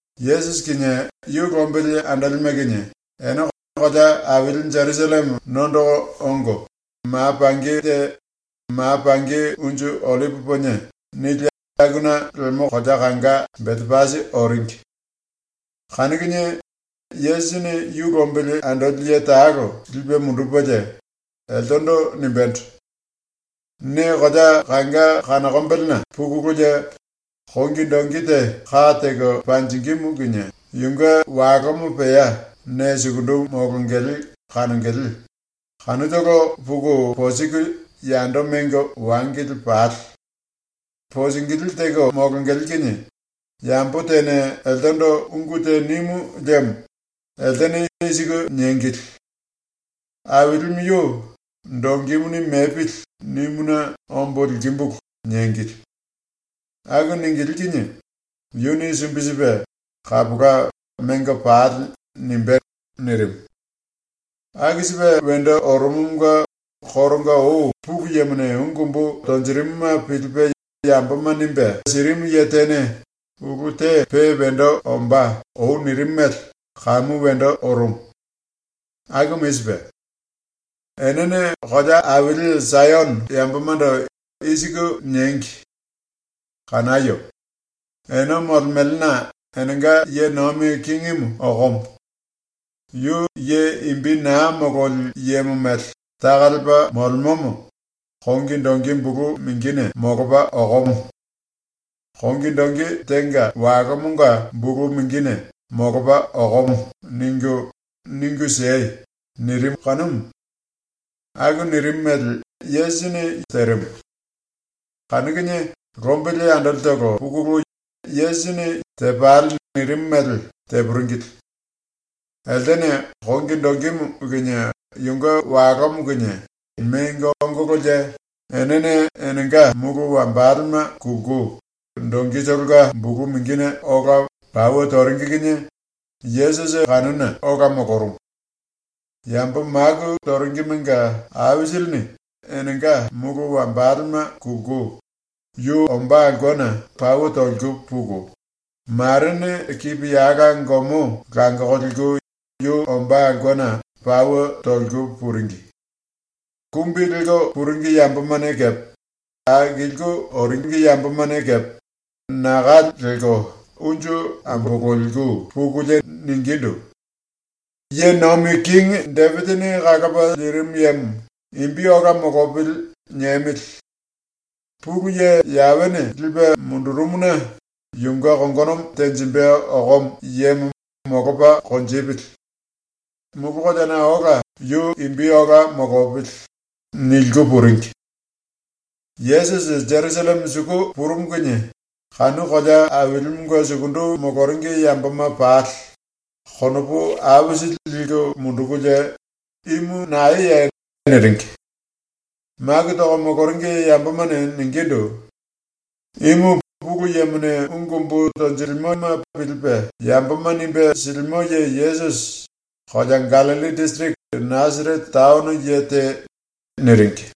⸤Yesusi kinie yu lombili andolime kinie⸥ ene kolea aili Jerusalleme nondoko ongo, ma pangi te ‘Ma Pangi Unju Ollipi Ponie’ nili akuna lemo kolea kanga Betepasi oringi. Kanu kinie Yesusini yu lombili andoli ye talo lipe mundupelie, eltendo nimbendo: “Ne kolea kanga kanokombelena pukululie kongi dongi te ka teko panjingímu kinie yunge walomo pea ne sukundu molongele kanongele, kanutolo puku posiku yando mengo wangili pale. Posingilí teko molongele kinie yambo tene eltendo ungu te nimu liemo eltene i siku niengili: “Ailimu yu ‘Dongimuni mepili.’ nimuna ombo likimbulu.” niengili. Aku ningilí kinie yuni sumbi sipe “Kapola, mengo pale.” nimbé.” nirimu. Aku sipe wendo orumumunge koronga ou Pulu Yemone ungu umbu tonjirimuma pilipe yamboma nimbe sirimu ye tene ulu te pe wendo ombá ou nirimu mele kamu wendo orumu. Akumu i sipe: “Enene kolea aili Sayono yambomando i siku niengi: “Kanayo! Ene molemelena enenga ye nomi kingimu okomo. Yu ye imbi na mololi yemo mele taka lepa molemomo kongi dongi bulu mingine molopa okomo. Kongi dongi tenga walomonga bulu mingine molopa okomo.” ningu, ningu siei.” nirimu kanumu. ⸤Aku nirimu mele Yesusi terimu.⸥ Kanu kinie lombili andolitolo pukulu Yesusini “Tepale.” nirimu mele tepuringili. Eltene kongi dongimu kinie yunge walomo kinie mengo ongololie, enene enenga mulu wambalema kulku dongitolonga bulu mingine ola pauwe toringi kinie Yesusi kanuna ola molorumu. Yambo maku toringimenga aisilini enenga mulu wambalema kulku yu ombá aulkena pauwe toliku puku, marene kipiyala gomo langoko liku yu ombá aulkena pauwe toliku puringi. Kumbi lelko puringi yambomane kepe akilku oringi yambomane kepe naka lelko unju ambololiku pukulie ningindu: “⸤Ye Nomi Kingi⸥ Depisini Kalopa Lirimu Yemo ‘Imbi ola molopili.’ niemili. Pulu Ye Yawene lipe mundurumuna yunge kongonomo tenjimbe okomo yemo molopa konjipili. Mulu koleana ola yu imbi ola molopili.” niliku puringi. Yesusi Jerusalleme suku purumu kinie kanu kolea ailimunge sukundu moloringi yamboma pali konopu aisili liku mundukulie “Imu naeye?” niringi. Maku toko moloringi yambomane ningindu: “Imu Pulu Yemone ungu umbu tonjilimoma pilipe yamboma nimbe silimo ye Yesusi, kolea Gallilli disiriki Nasarete taono ye te.” niringi.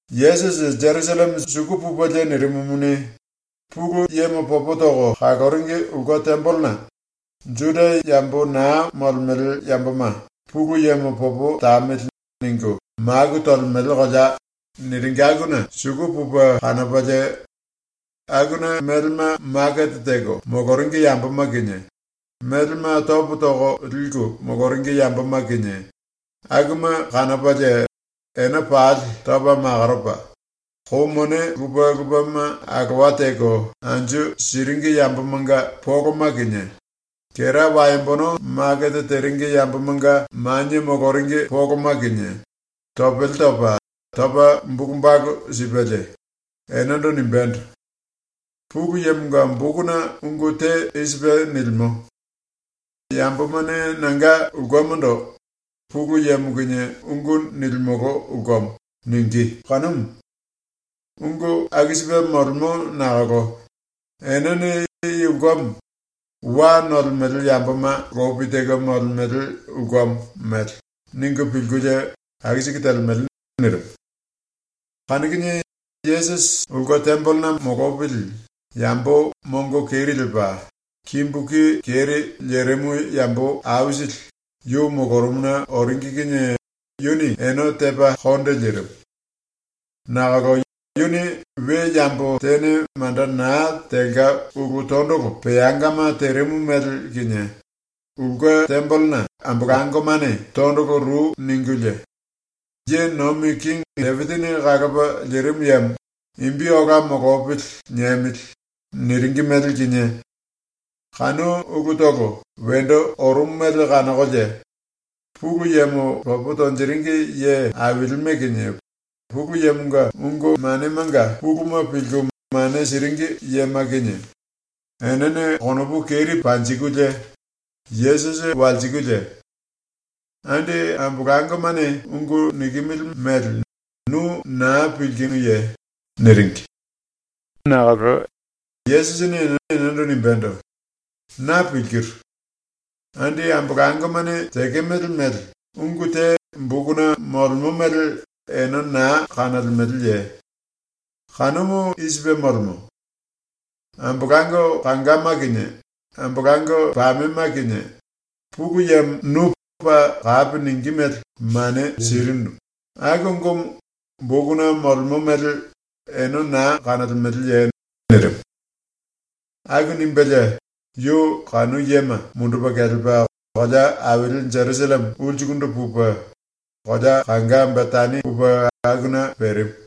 Yesusi ⸤Jerusalleme suku pupelie nirimumuni⸥ Pulu Yemo popo toko kaloringi ulke tembelena ⸤“Juda yambo na molemele yamboma ‘Pulu Yemo popo tamili.’ ningu maku tolemele kolea” niringi akuna⸥ suku pupe kanopalie akuna melema makete teko moloringi yamboma kinie, melema topo toko liku moloringi yamboma kinie akuma kanopalie ene pali topa makoropa, kou mone lupe lupema alowa teko anju siringi yambomanga poloma kinie, kera waembono makete teringi yambomanga manie moloringi poloma kinie, topele topa, topa bulu balu sipelie, enendo nimbendo: “Pulu Yemonga bokuna ungu te i sipe nilimo: ‘Yambomane nanga ulkemondo “Pulu Yemo kinie ungu nilimolo ulkemo.” ningí.’ kanumu. Ungu aku sipe molemo nakolo enene i ulkemo ‘wa nolemele yamboma lopi teko molemele ulkemo’ mele ningu pilkulie aku siku telemele.” nirimu. Kanu kinie Yesusi ulke tembelena molopili yambo mongo keri lepa, kimbu ki keri lerimu yambo aisili yu molorumuna oringi kinie yuni ene tepa konde lirimu. Nakolo yuni we yambo tene manda na telka ulu tondolo peangama terimu mele kinie, ulke tembelena ambolangomane tondolo ru ningulie: “Ye Nomi Kingi Depisini Kalopa Lirimu Yemo ‘Imbi ola molopili.’ niemili.” niringi mele kinie, kanu ulutolo wendo orumu mele kanokolie Pulu Yemo popo tonjiringi ye ailime kinie Pulu Yemonga ungu manemanga puluma pilku mane siringi yema kinie enene konopu keri panjikulie Yesusi walsikulie: “Andi ambolangomane ungu nikimili mele nu ⸤naa⸥ pilkinuye?” niringi. ⸤Nakolo⸥ Yesusini enendo nimbendo: “Na pilkiru. ⸤Andi ambolangomane tekemele mele⸥ ungu te bokuna molemo mele ene na kanolemeleye? Kanumu i sipe molemo: ‘Ambolango kangama kinie ambolango pamema kinie ⸤Pulu Yemo⸥ nu paa kapi ningí mele mane sirinu.’ aku ungumu bokuna molemo mele ene na kanolemeleye?” nirimu. Aku nimbelie yu kanu yema mundupe kelepa kolea aili ⸤Jerusalleme⸥ ulsukundu pupe kolea kanga Betani pupe akuna perimu.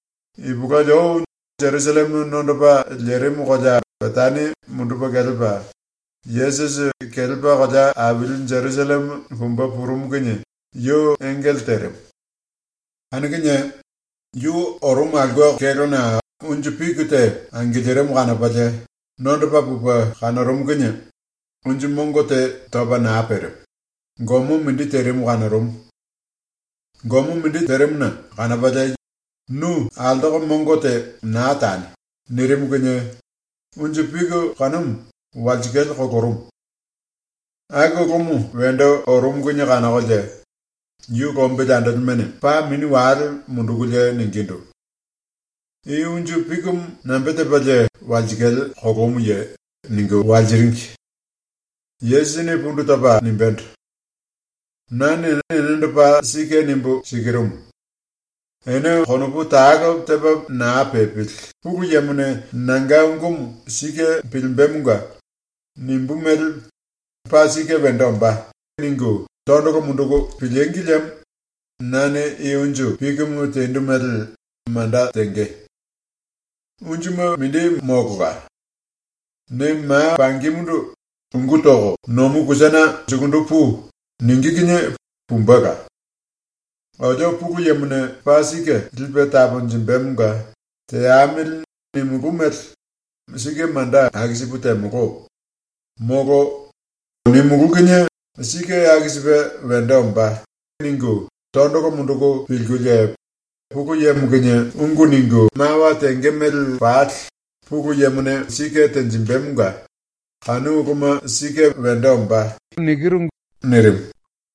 Ipulueli ou ⸤Jerusalleme nondopa lerimu kolea Betani mundupe kelepa Yesusi⸥ kelepa kolea aili ⸤Jerusalleme⸥ pumbe purumu kinie yu engele terimu. Kanu kinie yu orumu aulke kélona unju piki te angilirimu kanopalie nondopa pupe kanorumu kinie unju mongo te topa na perimu, gomo mindi terimu kanorumu. ⸤Gomo mindi terimuna⸥ kanopalie “Nu altoko mongo te na tani.” nirimu kinie unju piki kanumu walsikale kolorumu. Aku ulumu wendo orumu kinie kanokolie yu lombili andolimene paa mini wale mundukulie ningindu: “I unju pikimu nambe tepalie walsikale kolomuye?” ningu walsiringi. Yesusini pundu topa nimbendo: “Nane enendo paa sike nimbu sikirumu: Ene konopu talo tepa na pepili ⸤Pulu Yemone nanga ungumu sike pilimbemonga nimbú mele ‘paa sike wendo ombá.’ ningu⸥ tondolo munduku pilíngi liemo nane i unju pikimu tendu mele manda tenge. Unjuma mindi molola. Ne ma pangimundu “Ungú toko nomu kusana sukundu pui.” ningí kinie pumbela. ‘Olio ⸤Pulu Yemone paa sike lipe taponjimbemonga ‘Teamili.’ nimulú mele sike manda aku sipu temolo.’ molo ‘Nimulú kinie sike aku sipe wendo ombá.’ ningu⸥ tondolo munduku pilkulie ⸤Pulu Yemo kinie⸥ ungu ningu mawa tenge mele pali Pulu Yemone sike tenjimbemonga kanu uluma sike wendo ombá.” nirimu.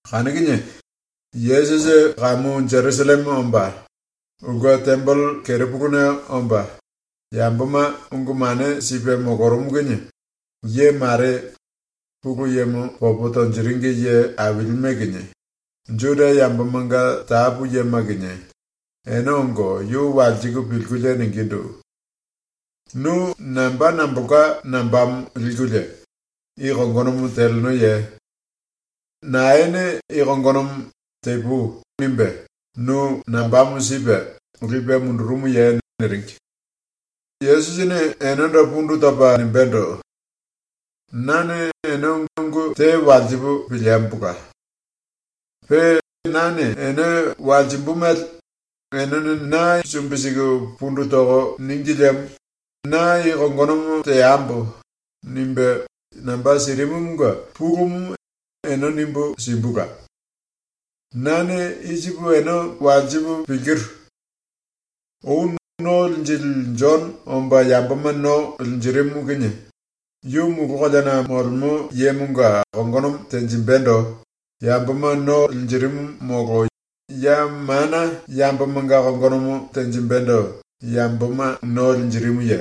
Kanu kinie Yesusi ⸤kamu Jerusalleme omba⸥ ulke tembele kerepuluna omba, yamboma ungu mane sipe molorumu kinie ye mare, Pulu Yemo popo tonjiringi ye ailime kinie, Juda yambomanga tapu yema kinie ene ongo yu walsiku pilkulie ningindu: “Nu namba nambolka nambamo likulie i kongonomo telenoye? Naene i kongonomo ‘Tepui.’ nimbe nu nambamo sipe lipe mundurumuye?” niringi. Yesusini enendo pundu topa nimbendo: “Nane ene ungu te walsipu piliembola. Pe nane ene walsimbu mele enene na sumbi siku pundu toko níngi liemo ‘Na i kongonomo teambo.’ nimbe namba sirimumunge pulumu ene nimbu simbula. ⸤Nane i sipu ene walsipu pilkiru:⸥ Ou ⸤No Linjili⸥ Jono omba yamboma no linjirimu kinie yu mulu koleana molemo yemonga kongonomo tenjimbendo yamboma no linjirimu molo ya mana yambomanga kongonomo tenjimbendo yamboma no linjirimuye?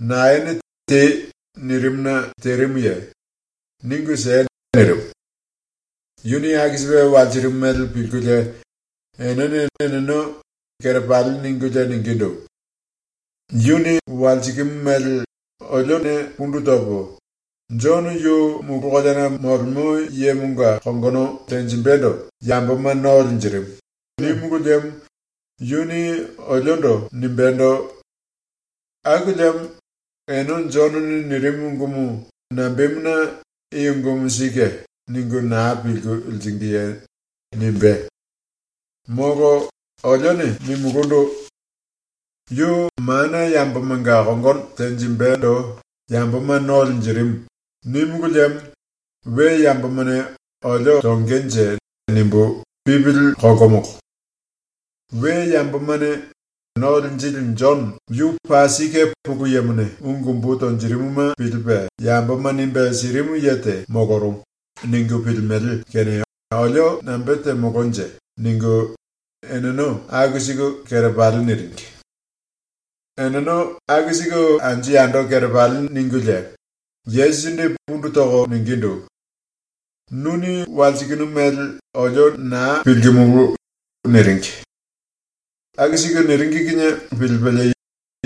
⸤Naene “Tei.” nirimuna terimuye? Ningu siei.⸥” nirimu. ⸤Yuni aku sipe walsirimu mele pilkulie⸥ enene eneno kerepali ningulie ningindu: “Yuni walsikimu mele olione pundu topo, ‘⸤Jono⸥ yu mulu koleana ⸤molemo yemonga kongono tenjimbendo yamboma no linjirimu⸥.’ nímulu liemo yuni oliondo nimbendo: ‘Aku liemo ene Jonone nirimu ungumu nambemuna ‘I ungumu sike.’ ningu na pilku liringiye?’ nimbé. Molo olione nimulundu: ‘Yu mana yambomanga ⸤kongono tenjimbendo yamboma no linjirimu⸥.’ nímulu liemo we yambomane ‘olio tongenje’ nimbu pipili kolkomolo. We yambomane ‘⸤No Linjili Jono⸥ yu paa sike Pulu Yemone ungu umbu tonjirimuma pilipe yamboma nimbe sirimu ye te molorumu.’ ningu pilimele kene olio nambe temolonje?” ningu eneno aku siku kerepali niringi. ⸤Eneno aku siku anju yando kerepali ningulie⸥, Yesusindu pundu toko ningindu: “⸤Nuni walsikinu mele⸥ olio na pilkimulu.” niringi. Aku siku niringi kinie pilipelie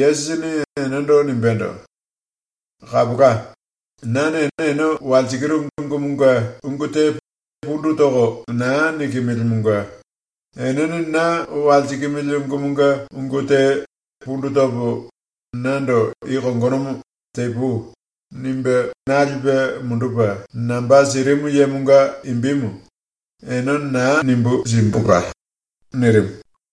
Yesusini enendo nimbendo: “Kapola. ⸤Nane ene walsikiru ungumunge ungu te pundu toko na nikimilimunge⸥ enene na walsikimili ungumunge ungu te pundu topo nando i kongonomo ‘Tepui.’ nimbe na lipe mundupe namba sirimu yemonga imbimu ene na nimbu simbula.” ⸤nirimu.⸥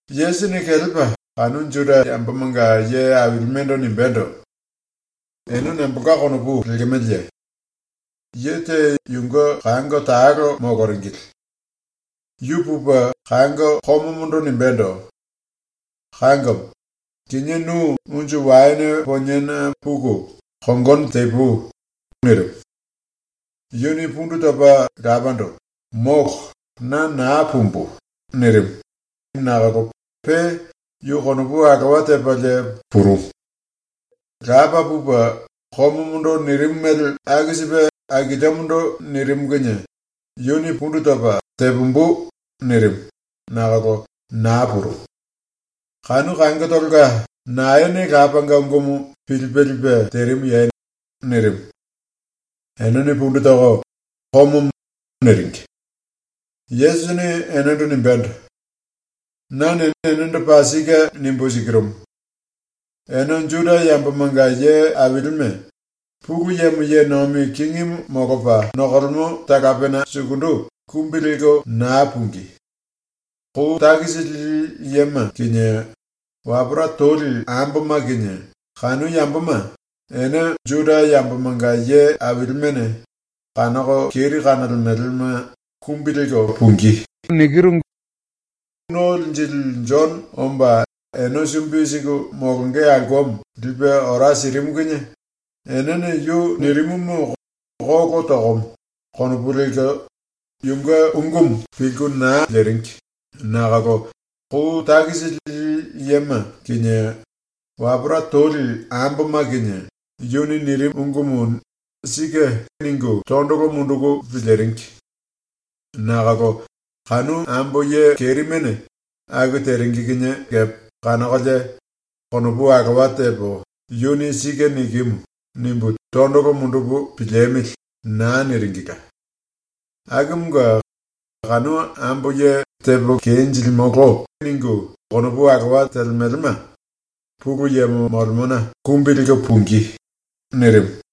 ⸤Yesusini kelepa kanu Juda yambomanga ye ailimendo nimbendo:⸥ “Ene nambolka konopu lekemeleye? Ye te yunge kango talo moloringili. Yu pupe kango komomondo nimbendo: “Kangomo, kinié nu unju waene poniena puku kongono tepui.” nirimu. “Yuni pundu topa lapando “Molo, na na pumbu.” nirimu, nakolo pe yu konopu alowa tepalie purumu. “Lapa pupe komomondo nirimu mele aku sipe akiliomondo nirimu ⸤kinie⸥ yuni pundu topa “Tepumbu.” nirimu, nakolo na purumu. “Kanu kangotolonga naene lapanga ungumu pilipe lipe terimuye?” nirimu. Enene pundu toko “Komomo.” niringi. Yesusini enendo nimbendo: “Nane enendo paa sike nimbu sikirumu: Ene ⸤Juda yambomanga ye ailime⸥ Pulu Yemo ye nomi kingimu molopa nokolemo talapena sukundu ⸤kumbi lelko na pungí⸥.. Kou takisi lili yema kinie wapora toli amboma kinie ⸤kanu yamboma, ene Juda yambomanga ye ailimene kanoko keri kanolemelema⸥ kumbi lelko pungí. ⸤No Linjili⸥ Jono omba ene sumbi siku molonge aulkemo lipe ora sirimu kinie enene yu nirimumu ‘Kolo tokomo.’ konopu lelko yunge ungumu pilku na liringi nakolo kou takisi lili yema kinie wapora toli amboma kinie yuni nirimu ungumu ‘Sike.’ ningu tondolo munduku piliringi. Nakolo kanu ambo ye kerimene aku teringi kinie kepe kanokolie ‘Konopu alowa tepo ‘Yuni sike nikimu.’ nimbu tondolo mundupu piliemili.’ na niringila. Akumunge ⸤kanu ambo ye “Tepo kenjilimolo.” ningu konopu alowa telemelema Pulu Yemo molemona kumbi lelko pungí⸥.” ⸤nirimu.⸥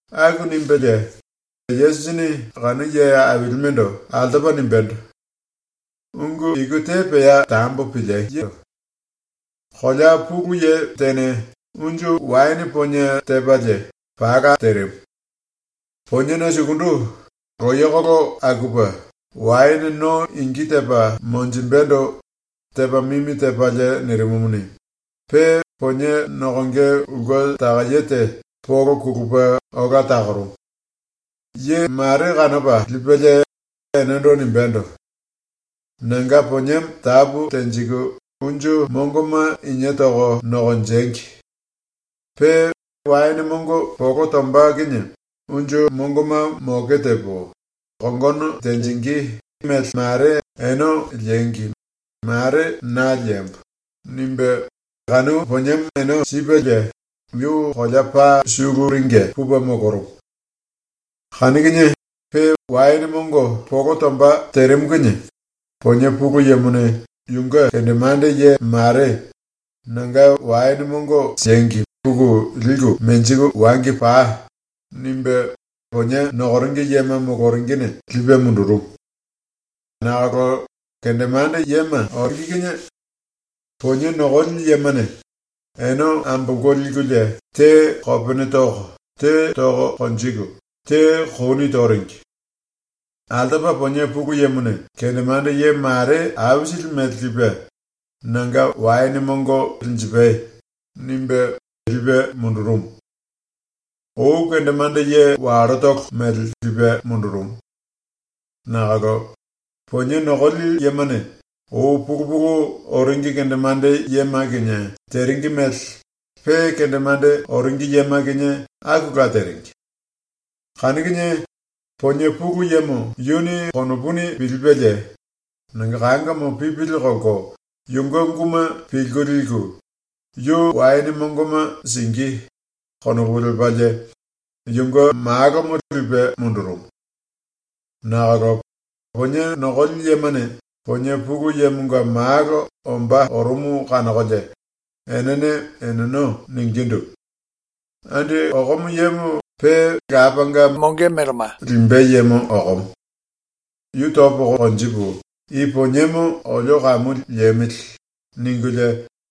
⸤Aku nimbelie Yesusini kanu ye ailimendo altopa nimbendo:⸥ “Ungu iku te pea tambo pilieyo. “Kolea pulu ye tene unju waene ponie tepalie pala terimu. Poniena sukundu loyekolo akupe waene no ingi tepa monjimbendo tepa mimi tepalie nirimumuni, pe ponie nokonge ulke takaye te polo kulupe ola takorumu. Ye mare kanopa lipelie enendo nimbendo: “Nanga poniemo tapu tenjiku unju mongoma inie toko nokonjengi. Pe waene mongo polo tomba kinie unju mongoma moke tepo, kongono tenjingí mele mare ene liengi mare na liembo.” nimbe kanu poniemo ene sipelie yu kolea paa suluringe pupe molorumu. Kanu kinie pe waene mongo polo tomba terimu kinie ponie pulu yemone yunge kendemande ye mare “Nanga waene mongo siengi puku liku menjiku wangi pai.” nimbe ponie nokoringi yema moloringine lipe mundurumu. Nakolo kendemande yema ⸤oringi kinie⸥ ponie nokoli yemane ene ambolko likulie te kopene toko, te toko konjiku, te kouni toringi. Altopa ponie pulu yemone kendemande ye mare aisili mele lipe “Nanga waene mongo linjipai.” nimbe lipe mundurumu, ou kendemande ye wallotolo mele lipe mundurumu. Nakolo ponie nokoli yemane ou pulu pulu oringi kendemande yema kinie teringi mele pe kendemande oringi yema kinie akula teringi. Kanu kinie ponie pulu yemo yuni ⸤konopuni pilipelie⸥ ‘Nanga kangomo pipili kolko yunge unguma pilku liku, yu waene mongoma singí.’ konopu lepalie yunge malomo lipe mundurumu. Nakolo ponie nokoli yemane ponie pulu yemonga malo ombá orumu kanokolie enene eneno ningindu: “Andi okomo yemo pe lapanga melema limbe yemo okomo. Yu topo konjipu i poniemo olio kamu liemili.” ningulie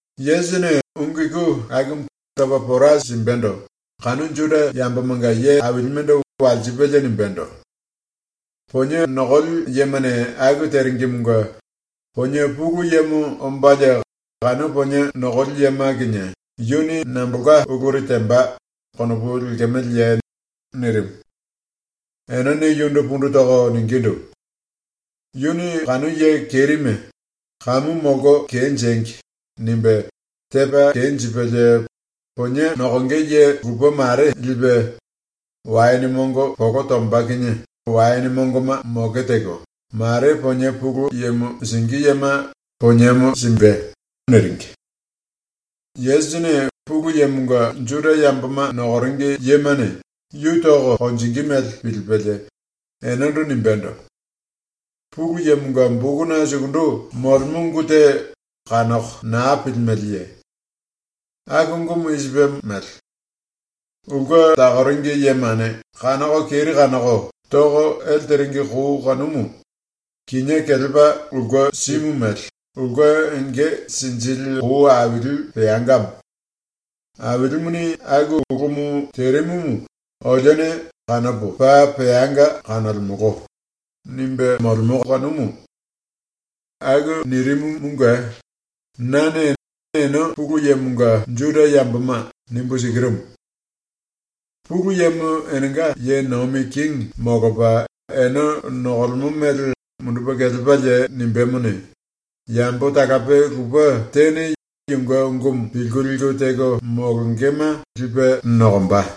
⸤Yesusini ungu iku akumu topa pora simbendo kanu Juda yambomanga ye ailimendo walsipelie nimbendo:⸥ “Ponie nokoli yemane aku teringimunge ponie pulu yemo ombalie kanu ponie nokoli yema kinie yuni nambolka uluri temba konopu lekemeleye?” nirimu. Enene yundu pundu toko ningindu: “Yuni kanu ye kerime ‘kamu molko kenjengi.’ nimbe tepa kenjipelie ponie nokonge ye lupe mare lipe waene mongo polo tomba kinie waene mongoma moke teko, mare ponie pulu yemo singí yema poniemo simbe.” niringi. Yesusini ⸤Pulu Yemonga Juda yamboma nokoringi yemane yu toko konjingí mele pilipelie⸥ enendo nimbendo: “Pulu Yemonga bokuna sukundu molemo ungu te kanoko na pilimeleye? ⸤Aku ungumu i sipe mele:⸥ “Ulke takoringi yemane kanoko keri kanoko toko ele teringi kou kanumu kinié kelepa ulke simu mele ulke enge sinjili kou aili peangamo. Ailimuni aku ulumu terimu olione kanopo paa peanga kanolemolo.” nimbe molemo kanumu. Aku ⸤nirimu⸥ munge nane ene ⸤Pulu Yemonga Juda yamboma⸥ nimbu sikirumu: Pulu Yemo enenga ye nomi kingi molopa ene nokolemo mele mundupe kelepalie nimbémone, yambo talape lupe tene yunge ungumu pilku liku teko molongema lipe nokomba.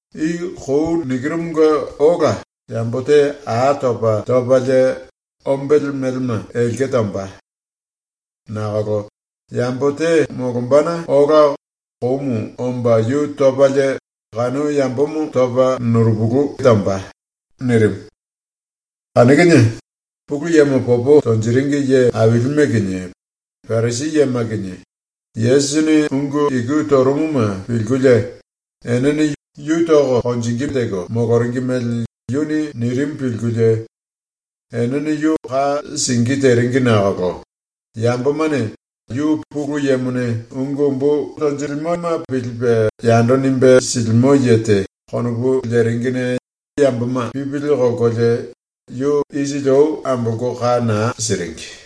(I kou ⸤nikiru⸥ munge ola yambo te a topa topalie ombele melema elke tomba. Nakolo yambo te molombana ola koumu omba yu topalie kanu yambomo topa nurupulu tomba.)” nirimu. Kanu kinie Pulu Yemo popo tonjiringi ye ailime kinie Parisi yema kinie Yesusini ungu iku torumuma pilkulie enene yu tonge teko moloringi mele yuni nirimu pilkulie enene yu ka singí teringi nakolo yambomane ‘Yu Pulu Yemone ungu umbu tonjilimoma pilipe yando nimbe silimo ye te.’ konopu leringine yamboma pipili kolkolie yu isili ou ambolko ka na siringi.